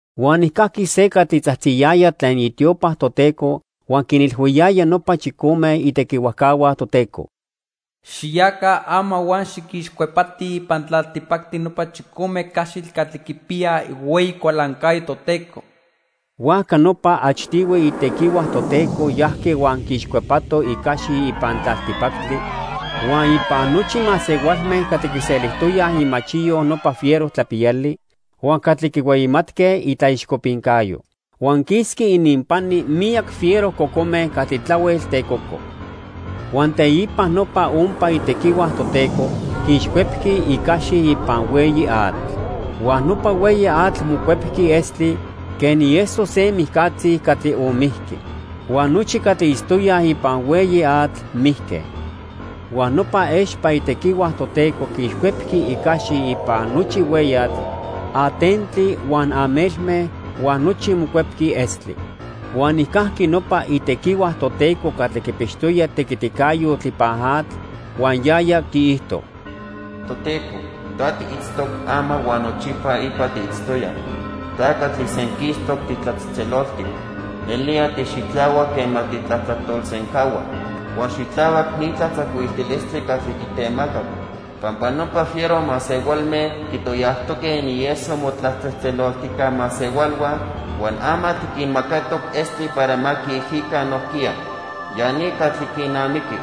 Huan nijcajqui se catli tzajtziyaya tlen itiopa Toteco huan quinilhuiyaya nopa chicome itequihuajcahua Toteco: "Xiyaca ama huan xiquixcuepatij ipan tlaltipactli nopa chicome caxitl catli quipiyaj ihueyi cualancayo Toteco." Huajca nopa achtihui itequihua Toteco yajqui huan quiixcuepato icaxi ipan tlaltipactli, huan ipan nochi masehualme catli quiselijtoyaj imachiyo nopa fiero tlapiyali huan catli quihueyimatque itlaixcopincayo. Huan quisqui ininpani miyac fiero cocome catli tlahuel tecoco. Huan teipa nopa ompa itequihua Toteco quiixcuepqui icaxi ipan hueyi atl. Huan nopa hueyi atl mocuepqui estli, quen ieso se mijcatzi catli onmijqui. Huan nochi catli itztoyaj ipan hueyi atl mijque. Huan nopa expa itequihua Toteco quiixcuepqui icaxi ipan nochi hueyatl, atentli huan amelme, huan nochi mocuepqui estli. Huan nijcajqui nopa itequihua Toteco catli quipixtoya tequiticayotl ipan atl, huan yaya quiijto: "Toteco, ta tiitztoc ama huan nochipa ipa tiitztoya. Ta catli senquistoc titlatzejtzeloltic. Nelía tixitlahuac quema titlatlajtolsencahua. Huan xitlahuac ni tlatzacuiltilistli catli titemacac. Pampa nopa fiero masehualme quitoyajtoque inieso motlatzejtzeloltijca masehualhua, huan ama tiquinmacatoc estli para ma quiijica nojquiya. Ya ni catli quinamiqui."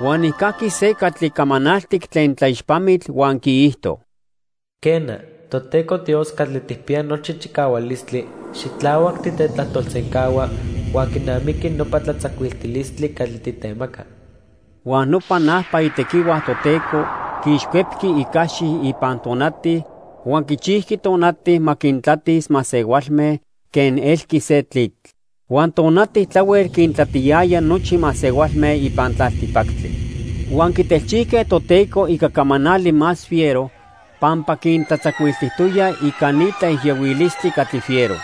Huan nijcajqui se catli camanaltic tlen tlaixpamitl huan quiijto: "Quena, Toteco Dios Catli Tijpiya Nochi Chicahualistli, xitlahuac titetlajtolsencahua huan quinamiqui nopa tlatzacuiltilistli catli titemaca." Huan nopa najpa itequihua Toteco quiixcuepqui icaxi ipan tonati huan quichijqui tonati ma quintlatis masehualme quen elqui se tlitl. Huan tonati tlahuel quintlatiyaya nochi masehualme ipan tlaltipactli. Huan quitelchijque Toteco ica camanali más fiero pampa quintlatzacuiltijtoya ica ni tlaijiyohuilistli catli fiero.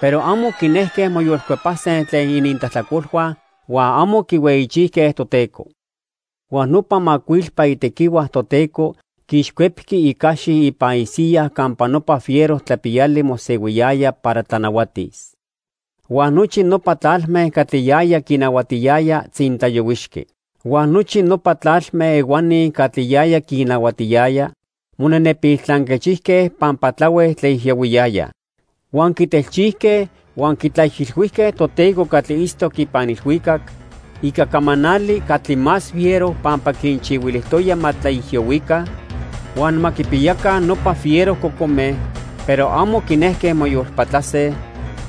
Pero amo quinejque moyolcuepase tlen inintlajtlacolhua huan amo quihueyichijque Toteco. Huan nopa macuilpa itequihua Toteco quiixcuepqui icaxi ipan isiya campa nopa fiero tlapiyali mosehuiyaya para tlanahuatis. Huan nochi nopa tlalme catli yaya quinahuatiyaya tzintlayohuixqui. Huan nochi nopa tlalme ehuani catli yaya quinnahuatiyaya monenepil tlanquechijque pampa tlahuel tlaijiyohuiyayaj. Huan quitelchijque huan quitlaijilhuijque Toteco catli itztoc ipan ilhuicac ica camanali catli más fiero pampa quinchihuilijtoya ma tlaijiyohuica huan ma quipiyaca nopa fiero cocome, pero amo quinejque moyolpatlase,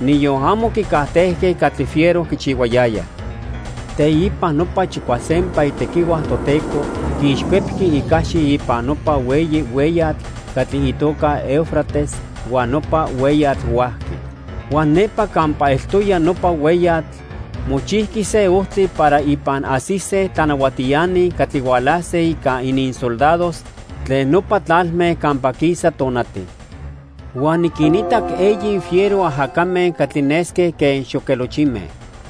niyon amo quicajtejque catli fiero quichihuayayaj. Teipa nopa chicuasempa itequihua Toteco quiixcuepqui icaxi ipan nopa hueyi hueyatl catli itoca Eufrates, huan nopa hueyatl huajqui. Huan nepa campa eltoya nopa hueyatl mochijqui se ojtli para ipan ajsise tlanahuatiani catli hualase ica ininsoldados tlen nopa tlalme campa quisa tonati. Huan niquinitac eyi fiero ajacame catli nesque quen xoquelochime.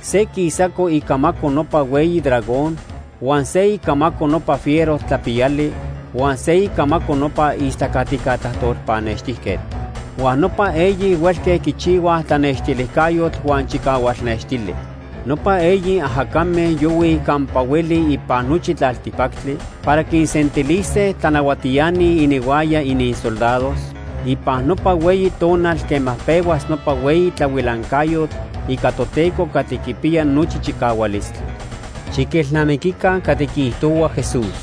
Se quisaco icamaco nopa hueyi dragón, huan se icamaco nopa fiero tlapiyali, huan se icamaco nopa istlacatica tlajtol pannextijquetl. Huan nopa eyi huelque quichihuaj tlanextilijcayotl huan chicahual nextili. Nopa eyi ajacame yohuij campa hueli ipan nochi tlaltipactli para quinsentilise tlanahuatiani ininhuaya ininsoldados ipan nopa hueyi tonal quema pehuas nopa hueyi tlahuilancayotl ica Toteco Catli Quipiya Nochi Chicahualistli. Xiquelnamiquica catli quiijtohua Jesús: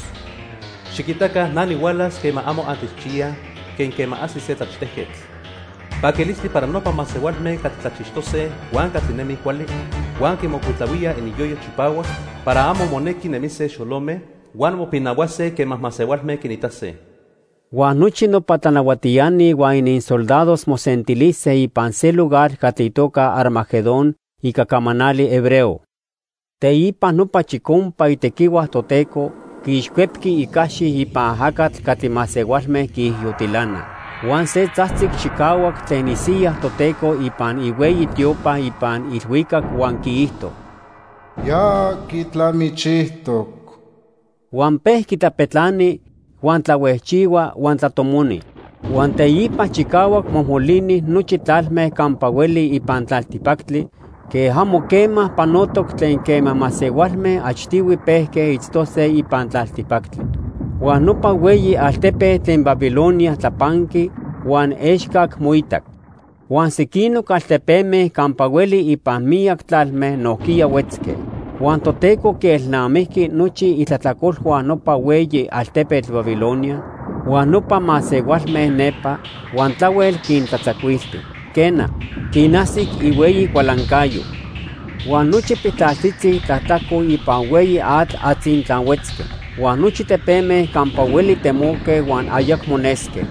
"Xiquitaca na nihualas quema amo antechchiyaj quen quema ajsi se tlachtejquetl. Paquilistli para nopa masehualme catli tlachixtose huan catli nemij cuali, huan quimocuitlahuíaj ininyoyo chipahuac para amo monequi nemise xolome, huan mopinahuase quema masehualme quinitase." Huan nochi nopa tlanahuatiani huan ininsoldados mosentilise ipan se lugar catli itoca Armagedón ica camanali hebreo. Teipa nopa chicompa itequihua Toteco quiixcuepqui icaxi ipan ajacatl catli masehualme quiijiyotilanaj. Huan se tzajtzic chicahuac tlen isiya Toteco ipan ihueyi tiopa ipan ilhuicac huan quiijto: "Ya quitlamichijtoc." Huan pejqui tlapetlani, huan tlahuejchihua, huan tlatomoni. Huan teipa chicahuac mojmolini nochi tlalme campa hueli ipan tlaltipactli quen amo quema panotoc tlen quema masehualme achtihui pejque itztose ipan tlaltipactli. Huan nopa hueyi altepetl tlen Babilonia tlapanqui huan excac moitac. Huan sequinoc altepeme campa hueli ipan miyac tlalme nojquiya huetzque. Huan Toteco quielnamijqui nochi itlajtlacolhua nopa hueyi altepetl Babilonia huan nopa masehualme nepa, huan tlahuel quintlatzacuilti. Quena, quinajsic ihueyi cualancayo. Huan nochi piltlaltzitzi tlatlajco ipan hueyi atl atzintlahuetzque. Huan nochi tepeme campa hueli temoque huan ayacmo nesque.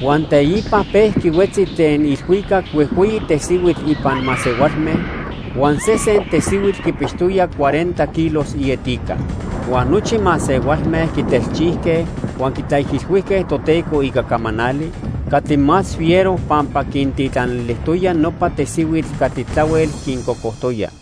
Huan teipa pejqui huetzi tlen ilhuicac huejhueyi tesihuitl ipan masehualme huan sesen tesihuitl quipixtoya cuarenta kilos ietica. Huan nochi masehualme quitelchijque huan quitlaijilhuijque Toteco ica camanali catli más fiero pampa quintitlanilijtoya nopa tesihuitl catli tlahuel quincocojtoya.